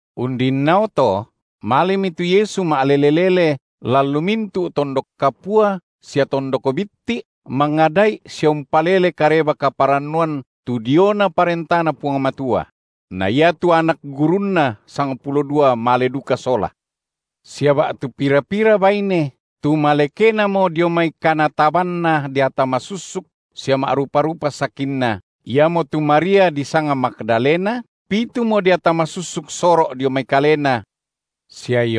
Undinnao to malemi tu Yesu ma’lele-lele lan lu mintu’ tondok kapua sia tondok bitti’, mangada’i sia umpalele Kareba-kaparannuan tu diona ParentaNa Puang Matua; na iatu anak gurunNa sangpulo dua male duka sola. Sia ba’tu pira-pira baine, tu malekenamo dio mai kanatabanna deata masussuk sia ma’rupa-rupa sakinna, iamotu Maria disanga Magdalena, pitumo deata masussuk soro’ dio mai kalena, sia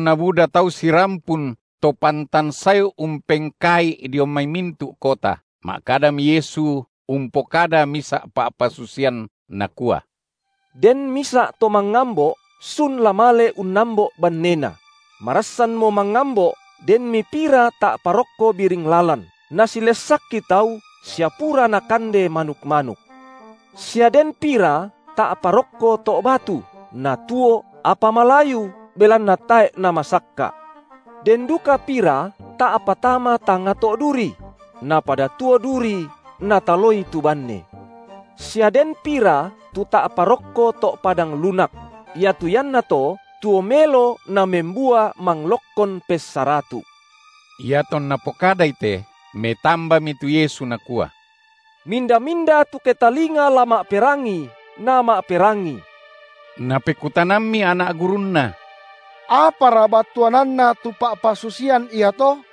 Iatonna buda tau sirampun to pantan sae umpengkaa’i dio mai mintu’ kota, ma’kadami Yesu umpokada misa’ pa’pasusian, Nakua: Den misa’ to mangambo’ sun la male unnambo’ bannena; marassanmo mangambo’, denmi pira ta’pa rokko biring lalan, nasilessakki tau sia pura nakande manuk-manuk; sia den pira ta’pa rokko to’ batu, natuo, apa malayu, belanna tae’ namasakka’. Den duka pira ta’pa tama tangnga to’ duri; napada tuo duri, nataloi tu banne. Sia den pira tu ta’pa rokko to’ padang lunak; iatu iannato tuo melo namembua manglokkon pessaratu’. Iatonna pokadai te, metambami tu Yesu nakua: Minda-minda tu ketalinga la ma’perangi, nama’perangi! Napekutanammi anak gurunNa: Apara battuananna tu pa’pasusian iato?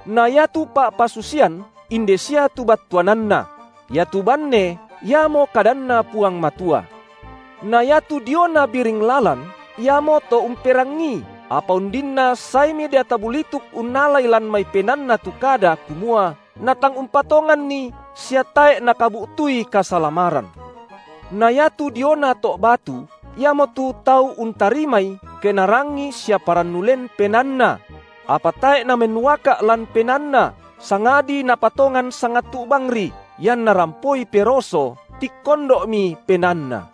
Na iatu pa’pasusian inde sia tu battuananna: Iatu banne iamo kadanNa Puang Matua. Na iatu diona biring lalan, iamoto umperangii, apa undinna saemi deata bulituk unnalai lan mai penaanna tu kada, kumua, natang umpatonganni sia tae’ nakabu’tui kasalamaran. Na iatu diona to’ batu, iamotu tau untarimai, ke narangii sia parannu len penaanna; apa tae’ namennuaka’ lan penaanna, sangadi napatongan sangattu’ bangri, ianna rampoi peroso, tikkondo’mi penaanna.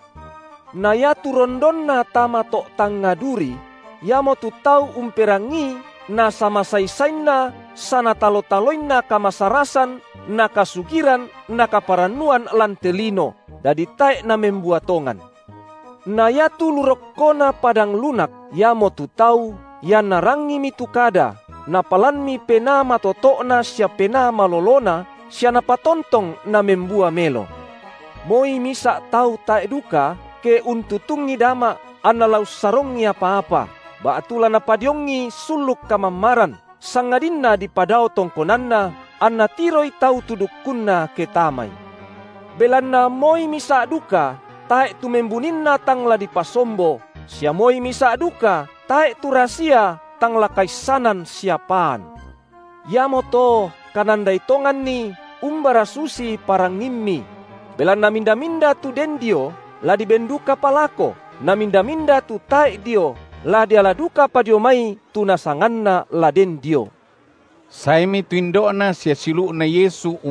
Na iatu rondonna tama to’ tangnga duri, iamotu tau umperangii na samasai-sainna sanatalo-taloinna kamasarasan na kasugiran na kaparannuan lan te lino, dadi tae’ namembua tongan. Na iatu lu rokkona padang lunak, iamotu tau, ianna rangimi tu kada, napalanmi penaa matoto’na sia penaa malolona sia napatontong namembua melo. Pa’pasusian diona dama’ Moi misa’ tau tae’ duka, ke untutungi dama’ anna la ussarongi apa-apa, ba’tu la napadiongi sulluk kamammaran, sangadinna dipadao tongkonanna, anna tiroi tau tu dukkunna, ke tamai. Belanna moi misa’ duka tae’ tu membuninna tang la dipasombo, sia moi misa’ duka tae’ tu rasia, tang la kaissanan sia paan. Iamoto kanandai tonganni, umbara susi parangimmi; belanna minda-minda tu den dio, la diben dukapa lako, na minda-minda tu tae’ dio, la diala dukapa dio mai tu nasanganna la den dio. Mindara tu indo’Na sia siulu’Na Puang Yesu?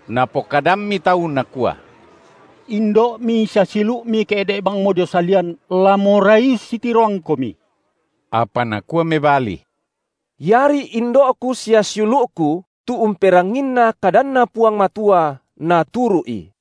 Napokadammi tau, nakua: Indo’Mi sia siulu’Mi ke’de’ bangmo dio salian, la morai ussitiroangKomi. Apa Nakua mebali: Iari indo’Ku sia siulu’Ku, tu umperanginna kadanNa Puang Matua naturu’i.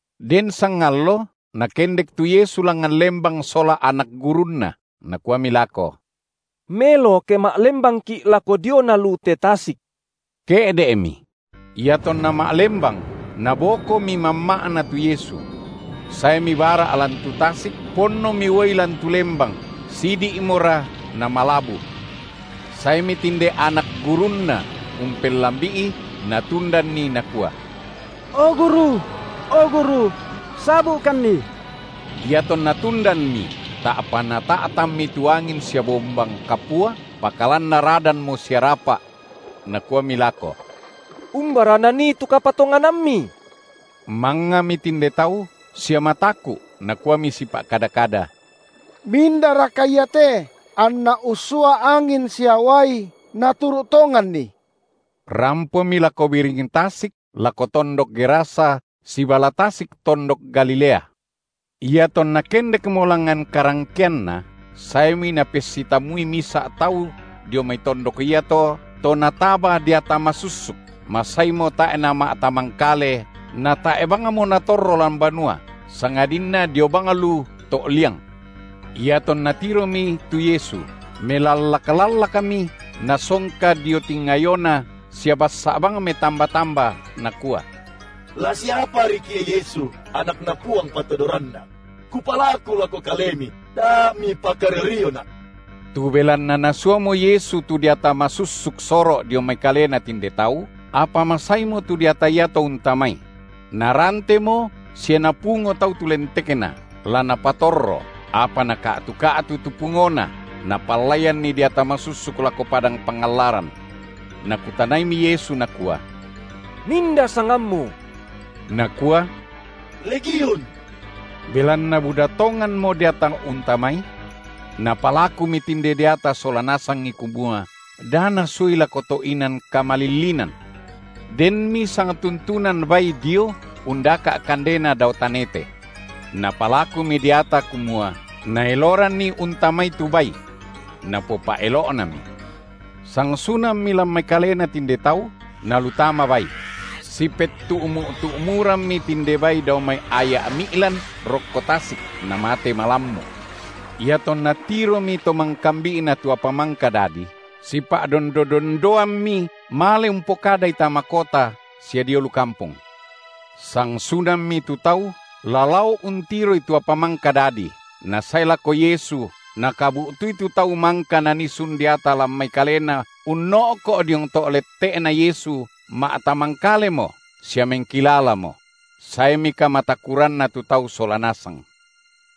Den sangallo Nakendek tu Yesu langngan lembang sola anak gurunNa, Nakuami lako: Melo ke ma’lembangki’ lako diona lu te tasik; ke’de’mi. Iatonna ma’lembang, nabokomi mamma’na tu Yesu. Saemi bara’ lan tu tasik, ponnomi uai lan tu lembang, sidi’mora namalabu. Saemi tinde anak gurunNa umpellambi’i, natundanNi, nakua: O Guru! o Guru! sabu’kanni! Iatonna tundanmi, ta’pa Nata’tanmi tu angin sia bombang kapua, pakalan naradanmo sia rapa’. Nakuami lako: Umbara nanii tu kapatonganammi? Mangngami tinde tau sia mataku’ nakuami sipa’kada-kada: Mindaraka Ia te, anNa ussua angin sia uai, naturu’ tonganNi. Rampomi lako biring tasik lako tondok to Gerasa, sibala tasik tondok Galilea. Iatonna kendekmo langngan karangkeanna, saemi napessitammui misa’ tau dio mai tondok iato to nataba deata masussuk, masaimo tae’ nama’tamangkale natae’ bangmo natorro lan banua, sangadinna dio bang lu to’liang. Iatonna tiromi tu Yesu, melallak-lallakmi nasongka dio tingayoNa sia bassa’ bang metamba-tamba, nakua: La siapariki’ e Yesu, AnakNa Puang Patodoranna? Kupalaku lako Kalemi da Mipakario-riona’. Tu belanna Nasuamo Yesu tu deata masussuk soro’ dio mai kalena tinde tau, apa masaimo tu deata iato untamai; narantemo sia napungo tau tu lentekna, la napatorro, apa naka’tu-ka’tu tu pungona, napallaianni deata masussuk lako padang pangallaran. Nakutanaimi Yesu Nakua: Minda sangammu? Nakua: Legiun, belanna buda tonganmo deata untamai. Napalakumi tinde deata sola nasangi kumua, da Nasuai lako to’ inan kamalillinan. Denmi sangtuntunan bai dio undaka’ kandena dao tanete. Napalakumi deata, kumua, Naeloranni untamai tu bai. Napopa’elo’nami. Sangsunammi lan mai kalena tinde tau, nalu tama bai; sipettu’mu’-tu’mu rammi tinde bai dao mai aya’ mi’lan rokko tasik, namate malammu’. Iatonna tiromi to mangkabi’na tu apa mangka dadi, sipa’dondo-dondoammi male umpokadai tama kota sia dio lu kampong. Sangsunammi tu tau, la lao untiroi tu apa mangka dadi, nasae lako Yesu, nakabu’tui tu tau mangka nanii sun deata lan mai kalena unno’ko’ diong to’ letteNa Yesu ma’tamangkalemo sia mengkilalamo; saemi kamatakuranna tu tau sola nasang.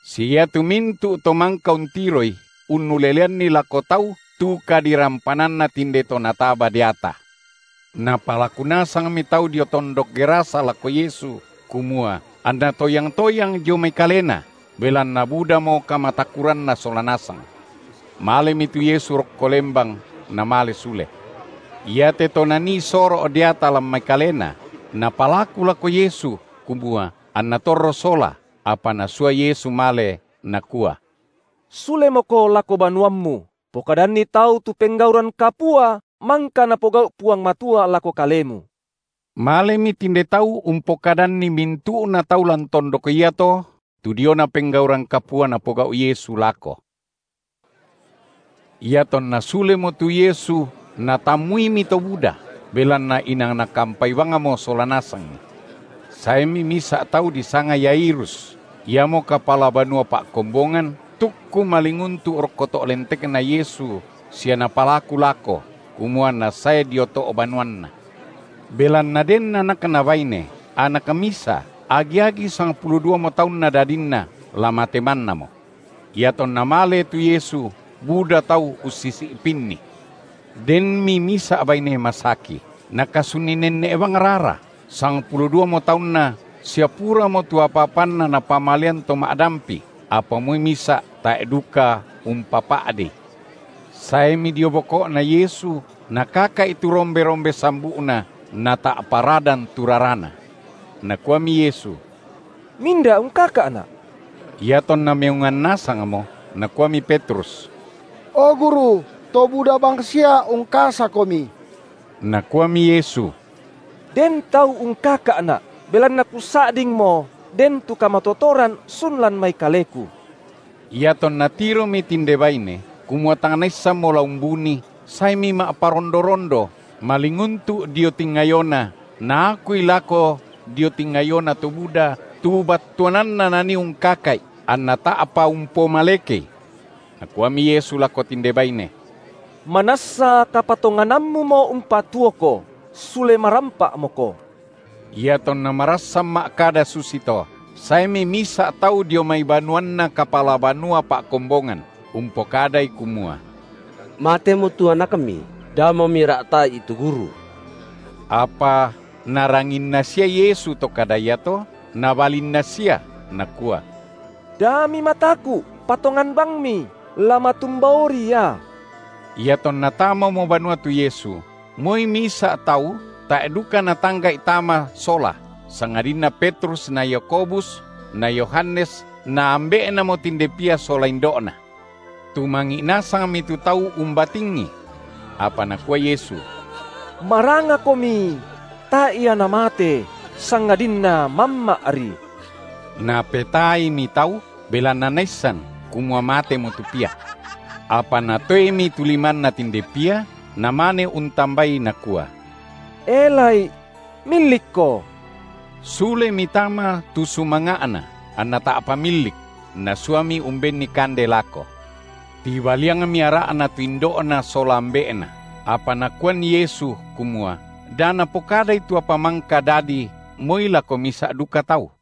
Sia iatu mintu’ to mangka untiroi unnuleleanni lako tau tu kadirampananna tinde to nataba deata. Napalaku nasangmi tau dio tondok Gerasa lako Yesu, kumua, anNa toyang-toyang dio mai kalena, belanna budamo kamatakuranna sola nasang. Malemi tu Yesu rokko lembang, Namale sule. Iate to nanii soro’ deata lan mai kalena, napalaku lako Yesu, kumua, anna torro sola, apa Nasua Yesu male, Nakua: Sulemoko lako banuammu, pokadanni tau tu penggauran kapua mangka napogau’ Puang Matua lako kalemu. Malemi tinde tau umpokadanni mintu’na tau lan tondok iato tu diona penggauran kapua Napogau’ Yesu lako. Iatonna sulemo tu Yesu natammuimi to buda, belanna inang nakampai bangmo sola nasangi. Saemi misa’ tau disanga Yairus, iamo kapala banua pa’kombongan, tukku malinguntu’ rokko to’ lentekNa Yesu sia napalaku lako, kumua anNa sae dio to’ banuanna, belanna den anakna baine, anak misa, agi-agi sangpulo duamo taunna dadinna, la mate mannamo. Iatonna male tu Yesu buda tau ussisi’pinNi. Denmi misa’ baine masaki, nakasunni nenne’ bang rara, sangpulo duamo taunna sia puramo tu apa-apanna napamalean to ma’dampi, apa moi misa’ tae’ duka umpapa’dei. Saemi dio boko’Na Yesu nakaka’i tu rombe-rombe sambu’Na, nata’pa radan tu rarana. Nakuami Yesu: Minda ungkaka’Na’? Iatonna meongan nasangmo nakuami Petrus: O Guru, to buda bangsia ungkasaKomi. Nakuami Yesu: Den tau ungkaka’Na’, belanna Kusa’dingmo den tu kamatotoran sun lan mai Kaleku. Iatonna tiromi tinde baine, kumua tang naissanmo la umbunii, saemi ma’parondo-rondo, malinguntu’ dio tingayoNa, naakui lako dio tingayona to buda tu battuanna nanii ungkaka’I anna ta’pa umpomalekei. Nakuami Yesu lako tinde baine: Manassa kapatonganammumo umpatuoko, sule marampa’moko. Iatonna marassan ma’kada susito, saemi misa’ tau dio mai banuanna kapala banua pa’kombongan, umpokadai kumua: Matemo tu anakmi, damo mira’ta’i tu Guru. Apa Naranginna sia Yesu to kada iato, Nabalinna sia, Nakua: Da mimataku’ patongan bangmi, la matumbaori ia! Iatonna tamamo banua tu Yesu, moi misa’ tau tae’ duka Natangga’i tama sola sangadinna Petrus na Yakobus na Yohanes na ambe’namo tinde pia sola indo’na. Tumangi’ nasangmi tu tau umbatingi. Apa Nakua Yesu: Marangakomi! tae’ ia namate, sangadinna mamma’ri. Napetaaimi tau, belanna naissan, kumua matemo tu pia. Apa Natoemi tu limanna tinde pia, namane untambai Nakua: E, lai’! millikko! Sulemi tama tu sumanga’na, anna ta’pa millik; Nasuami umbenni kande lako. Tibaliangmi ara’na tu indo’na sola ambe’na, apa Nakuan Yesu, kumua, da napokadai tu apa mangka dadi moi lako misa’ duka tau.